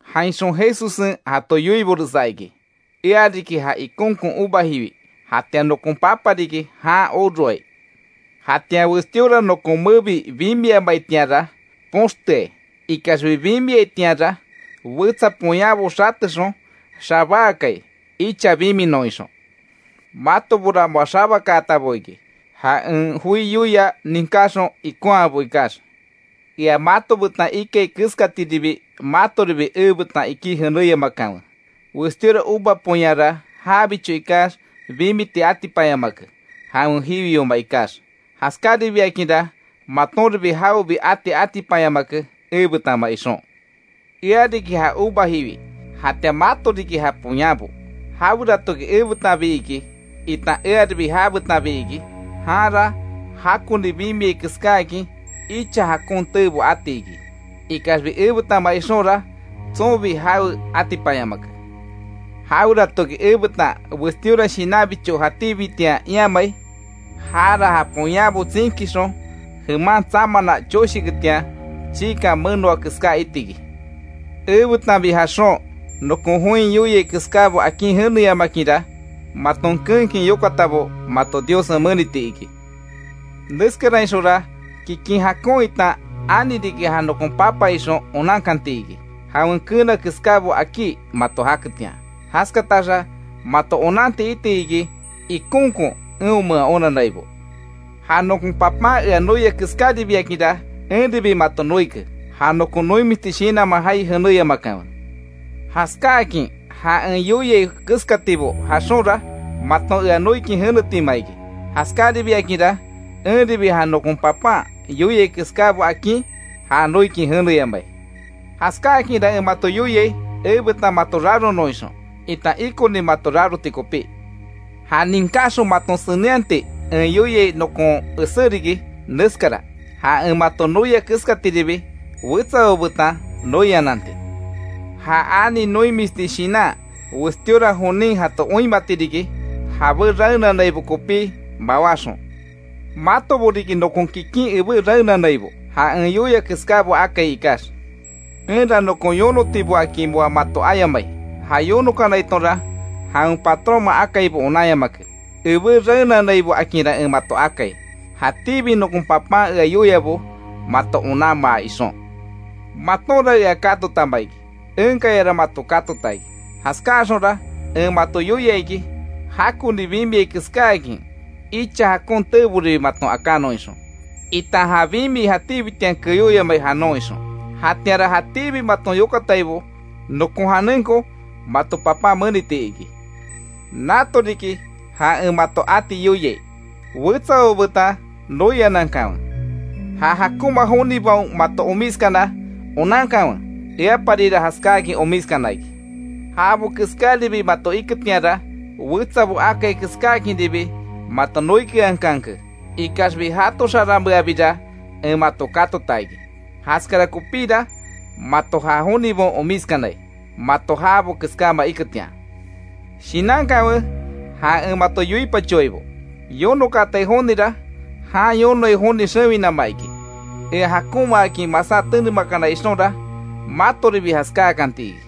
Jainxon Jesussen jato yoiboresa iki: “Eariki ja ikonkon uva jiwi, jatian nokon Papa riki jan oroai. Jatian westíora nokon mebi bimiamaitianra ponxteai, ikaxbi bimiaitianra wetsa ponyanbo xatexon, xabáakai icha biminon ixon. Matobora, moa xabakaatabo iki, ja en joi yoia ninkaxon ikonhabo ikax. Ea mato betan ikai keskatiribi matoribi ebetan ikí jeneyamakanwe, westíora uva ponyanra jabicho ikax bimiti atipanyamake, jawen jiwioma ikax, jaskaribiakinra matonribi jawebi ati atipanyamake, ebetanma ixon. Eariki ja uva jiwi, jatian mato riki ja ponyanbo. Jaweratoki ebetanbi iki itan earibi jabetanbi iki, janra jakoni bimiai keskáakin, icha jakon teebo ati iki. Ikaxbi ebetanma ixonra, tsonbi jawe atipanyamake. Jaweratoki ebetan westíora shinanbicho jatíbitian iamai, jara ja ponyanbo tsinkixon jeman tsamana, choshiketian chiikan menoa keská itiki. Ebetanbi jaxon, nokon join yoiai keskábo akin jeneyamakinra, maton keenkin yokatabo mato Diossen meniti iki. Neskarainxonra kikin jakon itan ani riki ja nokon Papa ixon onankanti iki, jawen keena keskábo akí mato jaketian, jaskataxa, mato onanti iti iki, ikonkon eonmea onannaibo. Ja nokon Papan ea noia keskáribiakinra, enribi mato noike, ja nokon noimisti shinanman jaai jeneyamakanwe. Jaskáakin ja en yoiai keskatibo jaxonra, maton ea noikin jenetima iki, jaskáribiakinra enribi ja nokon papan yoiai keskábo akin ja noikin jeneyamai. Jaskakinra en mato yoiai ebetan mato raronon ixon, itan ikoni mato raroti kopí. Ja ninkaxon maton senenhati en yoiai nokon esé riki neskara: Ja en mato noia keskatiribi, wetsabo betan noiananti. Ja ani noimisti shinan westíora jonin jato oinmati riki, jabé raenanaibo kopí mawáxon. Matobo riki nokon kikin ebé raenanaibo, ja en yoia keskábo akai ikax. Enra nokon yonotibo akin moa mato ayamai. Ja yonokanaitonra jawen patrónman akaibo onanyamake. Ebé raenanaibo akinra en mato akai, jatíbi nokon Papan ea yoiabo mato onanmaa ixon. Matonra ea katotama iki, Enkayara mato katota iki, jaskáaxonra en mato yoia iki, jakoni bimiai keskáakin icha jakon teeboribi maton akanon ixon, itan ja bimi jatíbitian keyóyamai janon ixon. Jatianra jatíbi maton yokataibo, nokon janenko mato Papan meniti iki. Nato riki ja en mato ati yoiai: Wetsabo betan noianankanwe. Ja jakonma jonibaon mato omiskana, onankanwe, eaparira jaskáakin omiskana iki. Jabo keskaribi mato iketianra, wetsabo akai keskáakinribi mato noikeankanke. Ikaxbi jato xaranmeabira en mato katota iki, jaskara kopíra mato ja jonibaon omiskanai, mato jabo keskáma iketian. Shinankanwe ja en mato yoipachoaibo: ‘Yonokaatai jonira, jan yonoai joni xewinama iki’. Ea jakonmaakin masá tenemakana ixonra, matoribi jaskáakanti iki;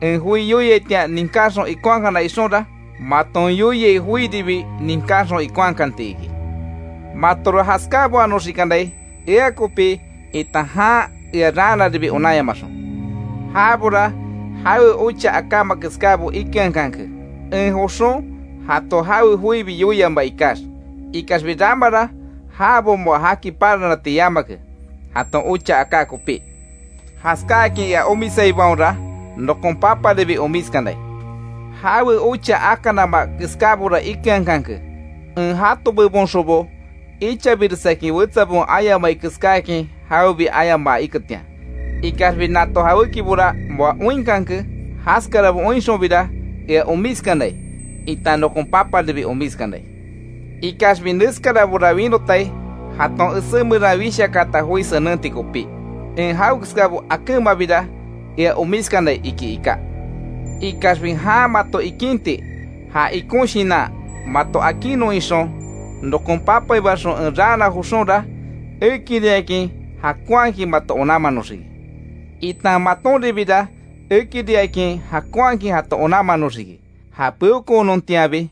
en joi yoiaitian ninkaxon ikonhakana ixonra, maton yoiai joiribi ninkaxon ikonhakanti iki. Matora jaskáboanoxikanai ea kopi, itan jan ea raanaribi onanyamaxon. Jabora jawe ocha akanama keskábo ikeankanke, en joxon jato jawe joibi yoiama ikax. Ikaxbi ramara jabo moa jaki paranati yamake, jaton ocha aká kopi. Jaskáakin ea omisaibaonra nokon Paparibi omiskanai. Jawe ocha akanama keskábora ikeankanke, en jato bebonxonbo ichabiresakin wetsabaon ayamai keskáakin jawebi ayamaa iketian. Ikaxbi nato jawékibora moa oinkanke, jaskarabo oinxonbira ea omiskanai, itan nokon Paparibi omiskanai. Ikaxbi neskarabora winotai, jaton esé meran wishakaata joi senenti kopí: ‘En jawekeskabo akenmabira, ea omiskanai’, iki iká. Ikaxbi jan mato ikinti ja ikon Shinan mato akinnon ixon, nokon papaibaxon en raana joxonra, ekiriakin jakonhakin mato onanmanoxiki. Itan matonribira ekiriakin jakonhakin jato onanmanoxiki, ja peokoonontianbi,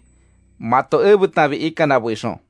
mato ebetanbi ikanabo ixon.